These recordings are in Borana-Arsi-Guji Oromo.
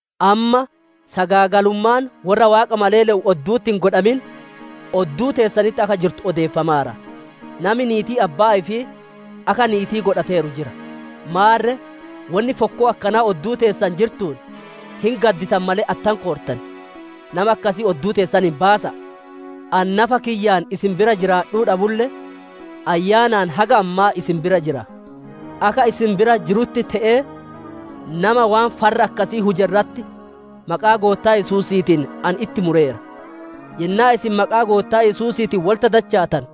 Amma, sagaagalummaan worra Waaqa malee le'u oddu'uttuu hin godhamin, odduu teessanitti akka jirtu odeeffamaara. Nami niitii abbaa ifii haadiqqoo ifii akka niiti'ii godhateeru jira. Maarre, wonni fokkoo akkanaa odduu teessan jirtuun hin gadditan malee, attam koortan? Nama akkasii odduu teessaniin baasa'a. Ani nafa kiyyaan isin bira jiraadhuu dhabulle, ayyaanaan haga ammaa isin bira jira; akka isin bira jiruutitti te'ee nama waan farra akkasii huje irratti maqaa Goottaa Yesuusiitiin ani itti mureera. Yennaa isin maqaa Goottaa Yesuusiitiin wolitti dachaatanu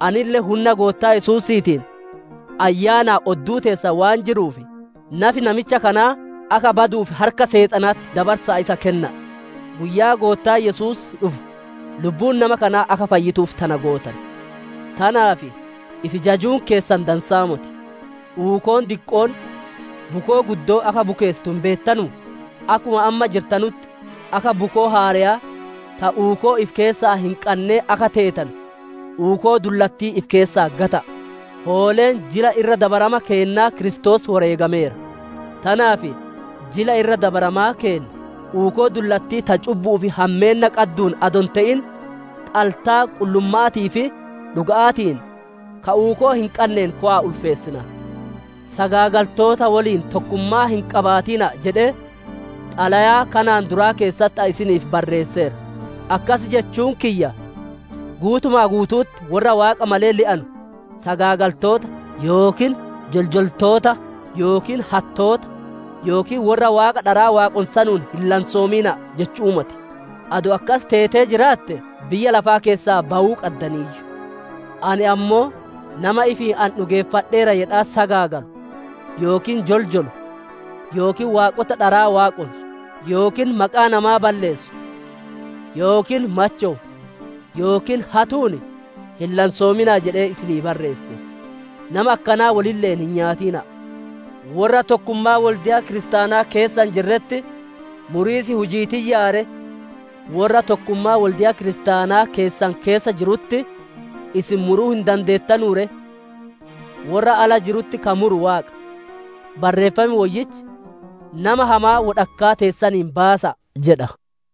anille hunna Goottaa Yesuusiitiin ayyaanaan odduu teessan waan jiruuf, nafi namicha kanaa akka baduuf harka Seexanaatitti dabarsa'a isa kenna'a; guyyaa Goottaan Yesuus dhufu lubbuun nama kanaa akka fayyituuf tana gootan. Tanaaf ifi jajuun keessan dansa'aa moti. Uukoon diqqoon bukoo guddoo akka bukeessitu hin beettanuu? Akkuma amma jirtanutti akka bukoo haareyaa ta uukoo ifi keessaa hin qannee akka teetanu, uukoo dullattii ifi keessaa gata'a. Hooleen Jila Irra Dabarama keennaa Kiristoos woreegameera. Tanaaf Jila Irra Dabarama keennaa, uukoo dullattii ta cubbu'uu fi hammeenna qadduun adoo hin te'in, xaltaa qullumma'aatii fi dhuga'aatiin ka uukoo hin qanneen kowa'a ulfeessina. Sagaagaltoota woliin tokkummaa hin qabaatina'a jedhee Xalayaa kanaan duraa keessatti ani isiniif barreesseera. Akkas jechuun kiyya guutuma guutu'utti worra Waaqa malee le'anu sagaagaltoota, yookiin joljoltoota, yookiin hattoota, yookiin worra waaqota dharaa waaqonsanuun hin lansoomina'a jechu'uu moti. Adoo akkas teetee jiraatte biyya lafaa keessaa bawuu qaddaniiyyu. Ani ammoo nama ifiin ani dhugeeffadheera jedhaa sagaagalu, yookiin joljolu, yookiin waaqota dharaa waaqonsu, yookiin maqaa namaa balleessu, yookiin machowu, yookiin hatuun hin lansoomina'a jedhee isinii barreesse. Nama akkanaa wolille'een hin nyaatina'a. Worra tokkummaa wolde'a kiristaanaa keessa hin jiretti muriis hujii tiyyaa ree? Worra tokkummaa wolde'a kiristaanaa keessan keessa jirutti isin muruu hin dandeettanuu ree? Worra ala jirutti ka muru Waaqa. Barreeffam Woyyichi, «Nama hamaa wodhakkaa teessaniin baasa'a» jedha.